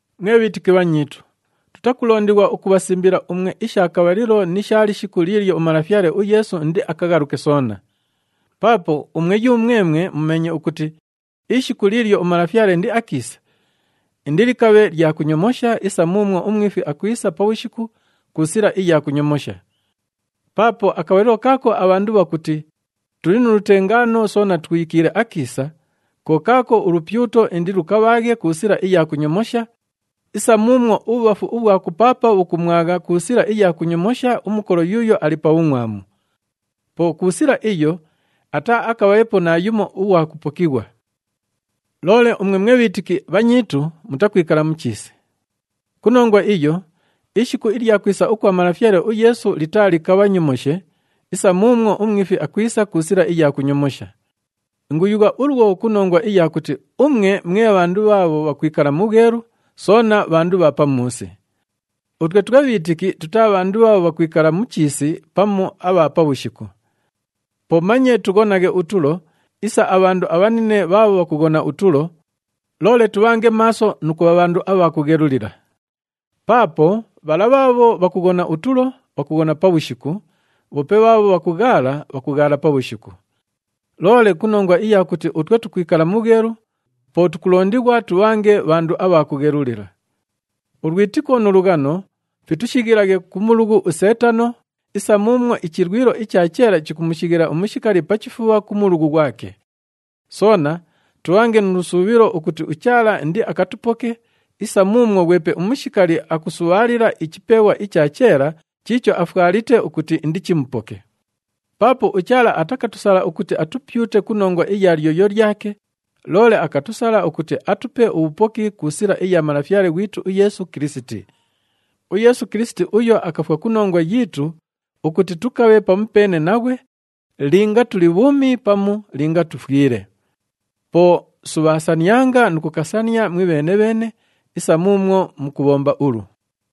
Mwe bhiitiki bhanyiitu, tutakulondighwa ukubhasimbila umwe isha kabhalilo ni sha lishiku liilyo uMalafyale uYeesu indiakaghaluke soona. Paapo umwe yumwemwe mumeenye ukuti ishiku liilyo uMalafyale indiakiise, indilikabhe lya kunyomosha isa muumwo umwifi akwisa pabhushiku ku sila iya kunyomosha. Paapo akabhalilo kaako abhandu bhakuti, “Tuli nu lutengaano soona twikiile akiisa,” ko kaako ulupyuto indilukabhaaghe ku sila iya kunyomosha isa muumwo ubhubhafu ubhwa kupaapa bhukumwagha ku sila iya kunyomosha umukolo yuuyo ali pa bhungʼwamu. Po ku sila iyo, ataaakabheepo naayumo ughwa kupokighwa. Loole umwe mwe bhiitiki bhanyiitu mutakwikala mu chiisi. Ku nongwa iyo, ishiku ilya kwisa ukwa Malafyale uYeesu litaalikabhanyomoshe isa muumwo umwifi akwisa ku sila iya kunyomosha. Inguyugha ulwo ku nongwa iya kuti umwe mwe bhandu bhaabho bhakwikala mu bhwelu, soona bhandu bha pamuusi. Utwe twe bhiitiki tutaa bhandu bhaabho bhakwikala mu chiisi pamu abha pabhushiku. Po manye tughonaghe utulo isa abhandu abhanine bhaabho bhakughona utulo, loole tubhange maaso nu kubha bhandu abha kughelulila. Paapo bhala bhaabho bhakughona utulo, bhakughona pabhushiku, bhoope bhaabho bhakughaala, bhakughaala pabhushiku. Loole ku nongwa iya kuti utwe tukwikala mu bhwelu, po tukulondighwa tubhange bhandu abha kughelulila. Ulwitiko nu lughano fitushighilaghe ku mulughu uSeetano isa muumwo ichilwilo icha cheela chikumushighila umushikali pa chifubha ku mulughu ghwake. Soona tubhange nu lusuubhilo ukuti uChaala indiakatupoke isa muumwo ghwepe umushikali akusubhaalila ichipeeghwa icha cheela chiicho afwalite ukuti indichimupoke. Paapo uChaala atakatusala ukuti atupyute ku nongwa iya lyoyo lyake, loole akatusala ukuti atupe ubhupoki ku sila iya Malafyale ghwitu uYeesu Kilisiti. UYeesu Kilisiti uyo akafwa ku nongwa yiitu ukuti tukabhe pamupeene naghwe, linga tuli bhuumi pamu linga tufwile. Po subhaasanianga nu kukasania mwibheene-bheene isa muumwo mukubhomba ulu.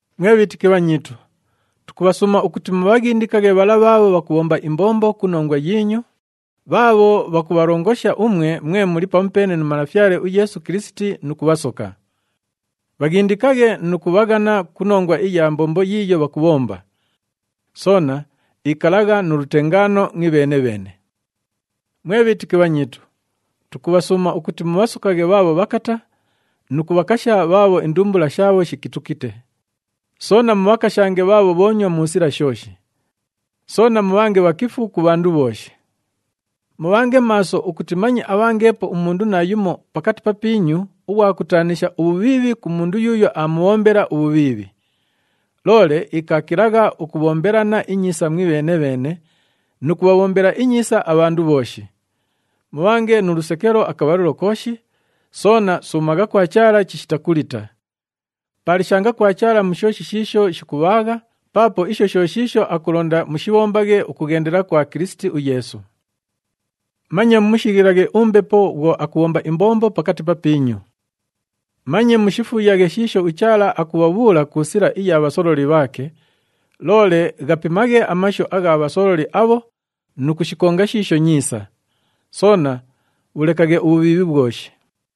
Mwe bhiitiki bhanyiitu, tukubhasuuma ukuti mubhaghindikaghe bhala bhaabho bhakubhomba imbombo ku nongwa yiinyu, bhaabho bhakubhalongosha umwe mwe muli pamupeene nu Malafyale uYeesu Kilisiti nu kubhasoka. Bhaghindikaghe nu kubhaghana ku nongwa iya mbombo yiiyo bhakubhomba. Soona ikalagha nu lutengaano mwibheene-bheene. Mwe bhiitiki bhanyiitu, tukubhasuuma ukuti mubhasokaghe bhaabho bhakata nu kubhakasha bhaabho indumbula shaabho shikitukite. Soona mubhakashange bhaabho bhoonywa mu sila shooshi. Soona mubhange bhakifu ku bhandu bhooshi. Mubhange maaso ukuti manye abhangeepo umundu naayumo pakati papiinyu ughwa kutaanisha ubhubhiibhi ku mundu yuuyo aamubhombela ubhubhiibhi. Loole ikaakilagha ukubhombelana inyiisa mwibheene-bheene nu kubhabhombela inyiisa abhandu bhooshi. Mubhange nu lusekelo akabhalilo kooshi, soona suumagha kwa Chaala chishita kulita. Paalishanga kwa Chaala mu shooshi shiisho shikubhaagha paapo isho sho shiisho akulonda mushibhombaghe ukughendela kwa Kilisiti uYeesu. Manye mumushighilaghe uMbepo uMwelu bhwo akubhomba imbombo pakati papiinyu. Manye mushifuuyaghe shiisho uChaala akubhabhuula ku sila iya bhasololi bhaake, loole ghapimaghe amashu agha bhasololi abho nu kushikonga shiisho nyiisa. Soona bhulekaghe ubhubhiibhi bhwoshi.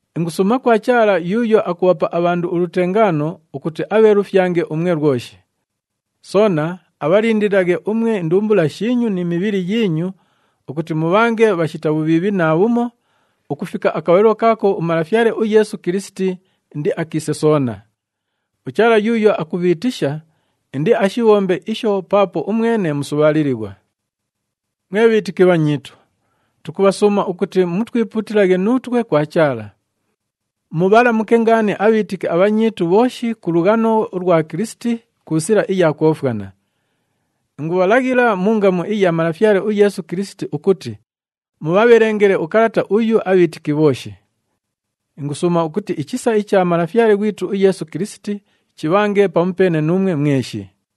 Ingusuuma kwa Chaala yuuyo akubhapa abhandu ulutengaano ukuti abheelufyange umwe lwoshi. Soona abhalindililaghe umwe indumbula shiinyu ni mibhili yiinyu ukuti mubhange bhashita bhubhiibhi naabhumo ukufika akabhalilo kaako uMalafyale uYeesu Kilisiti indiakiise soona. UChaala yuuyo akubhiitisha, indiashibhombe isho paapo umwene musubhaalilighwa. Mwe bhiitiki bhanyiitu, tukubhasuuma ukuti mutwipuutilaghe nuutwe kwa Chaala. Mubhalamuke ngaani abhiitiki abhanyiitu bhooshi ku lughano ulwa Kilisiti ku sila iya kwofwana. Ingubhalaghila mu ngamu iya Malafyale uYeesu Kilisiti ukuti mubhabhelengele ukalata uyu abhiitiki bhooshi. Ingusuuma ukuti ichisa icha Malafyale ghwitu uYeesu Kilisiti chibhange pamupeene nuumwe mweshi.